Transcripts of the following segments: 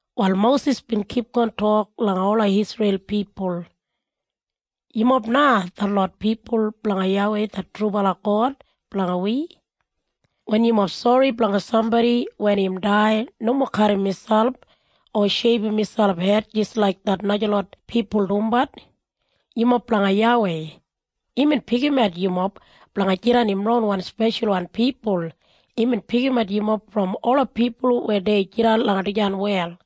Wal Mosis bin kipgon tok langa ola Isreil pipul, “Yumob na detlot pipul blanga YAWEI det trubala God blanga wi. Wen yumob sori blanga sambodi wen im dai nomo kadim miselp, o sheibum miselp hed jis laik det najalot pipul dumbat. Yumob blanga YAWEI. Imbin pikimat yumob blanga jidan im ronwan speshalwan pipul. Imbin pikimat yumob brom ola pipul weya dei jidan langa dijan wel.”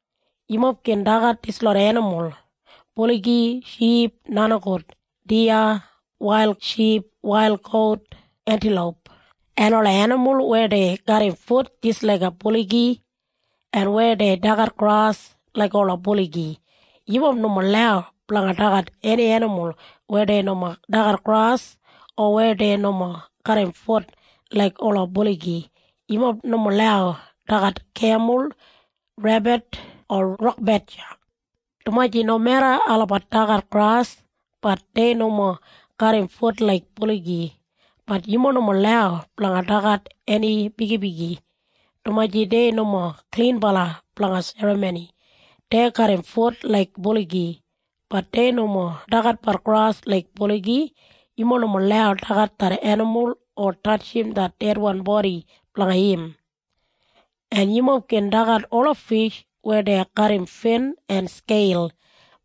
Yumob gin dagat dislot enimul, buligi, ship, nenigout, diya, wail ship, wail gout, entiloup, en ola enimul weya dei garram fut jis laiga buligi, en weya dei dagat gras laik ola buligi. Yumob nomo lau blanga dagat eni enimul weya dei nomo dagat gras o weya dei nomo garram fut laik ola buligi. Yumob nomo lau dagat kemul, rebit o rok bedja, dumaji nomeda olabat dagat gras, bat dei nomo garram fut laik buligi. Bat yumob nomo lau blanga dagat eni bigibigi dumaji dei nomo klinbala blanga serramoni. Dei garram fut laik buligi, bat dei nomo dagatbat gras laik buligi. Yumob nomo lau dagat det enimul o tatjim det dedwan bodi blanga im. “En yumob gin dagat ola fish weya dei garram fin en skeil.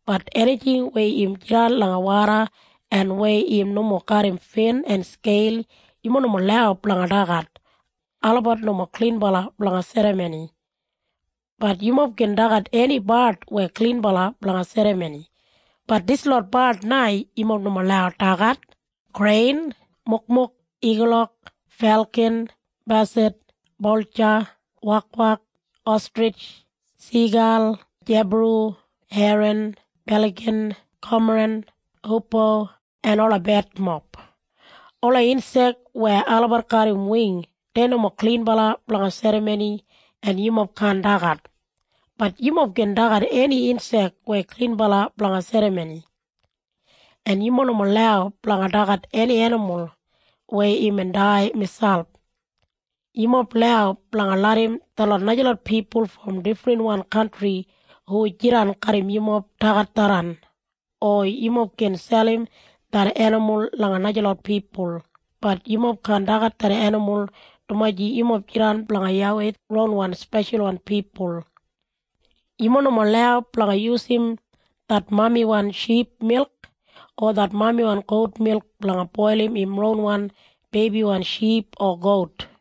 Bat enijing weya im jidan langa woda en weya im nomo garram fin en skeil yumob nomo lau blanga dagat. Olabat nomo klinbala blanga serramoni. “Bat yumob gin dagat eni bard weya klinbala blanga serramoni. Bat dislot bard na yumob nomo lau dagat, krein, mukmuk, igulok, felkin, basad, boltja, wakwak, ostrij, sigal, jebaru, herin, beligin, komaren, hupo en ola betmob. Ola insek weya olabat garram wing dei nomo klinbala blanga serramoni en yumob kaan dagat. Bat yumob gin dagat eni insek weya klinbala blanga serramoni. “En yumob nomo lau blanga dagat eni enimul weya imbin dai miselp. Yumob lau blanga larram detlot najalot pipul brom difrinwan kantri hu jidan garram yumob dagat tharran, o yumob gin selim det enimul langa najalot pipul. Bat yumob kaan dagat det enimul dumaji yumob jidan blanga YAWEI ronwan speshalwan pipul. Yumob nomo lau blanga yusum det mamiwan ship milk o det mamiwan gout milk blanga boilim im ronwan beibiwan ship o gout.”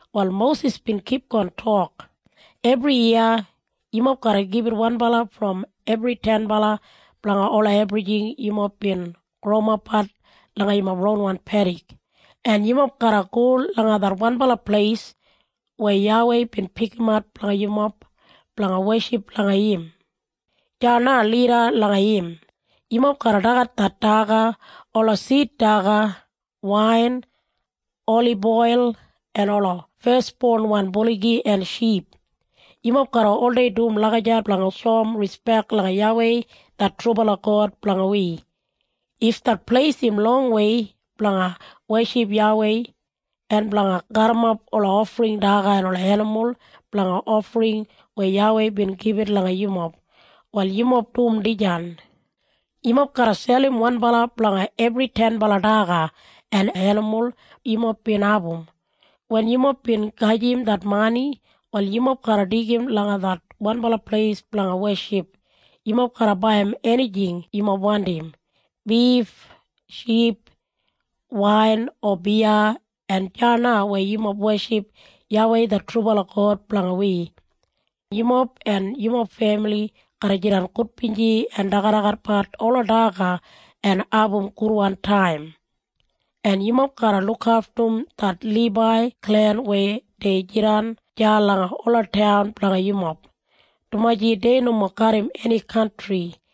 Wal Mosis bin kipgon tok, “Ebriyiya yumob garra gibit wanbala brom ebri tenbala blanga ola ebrijing yumob bin growimapbat langa yumob ronwan pedik. En yumob garra go langa det wanbala pleis weya YAWEI bin pikimat blanga yumob blanga weship langa im. Deya na lida langa im, yumob garra dagat det daga, ola sid daga, wain, oliboil, en ola fesbonwan buligi en ship. Yumob garra oldei dum lagijat blanga shoum rispek langa YAWEI det trubala God blanga wi. If det pleis im longwei blanga weship YAWEI en blanga garrimap ola ofring daga en ola enimul blanga ofring weya YAWEI bin gibit langa yumob, wal yumob dum dijan. Yumob garra selim wanbala blanga ebri tenbala daga en enimul yumob bin abum. Wen yumob bin gajim det mani, wal yumob garra deigim langa det wanbala pleis blanga weship. Yumob garra baiyim enijing yumob wandim, bif, ship, wain o biya en deya na weya yumob weship YAWEI det trubala God blanga wi, yumob, en yumob femili garra jidan gudbinji en dagadagatbat ola daga en abum gudwan taim. “En yumob garra lukaftum det Libai klen weya dei jidan deya langa ola taun blanga yumob, dumaji dei nomo garram eni kantri.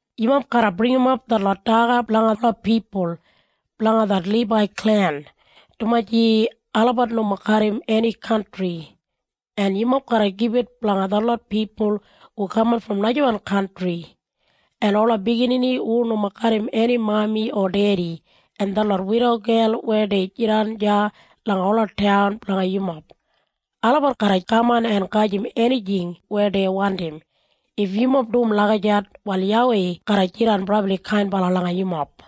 Yumob garra bringimap detlot daga blanga ola pipul blanga det Libai klen, dumaji olabat nomo garram eni kantri, en yumob garra gibit blanga detlot pipul hu kaman brom najawan kantri, en ola biginini hu nomo garram eni mami o dedi, en detlot widogel weya dei jidan deya langa ola taun blanga yumob. Olabat garra kaman en gajim enijing weya dei wandim. If yumob dum lagijat, wal YAWEI garra jidan brabli kainbala langa yumob.”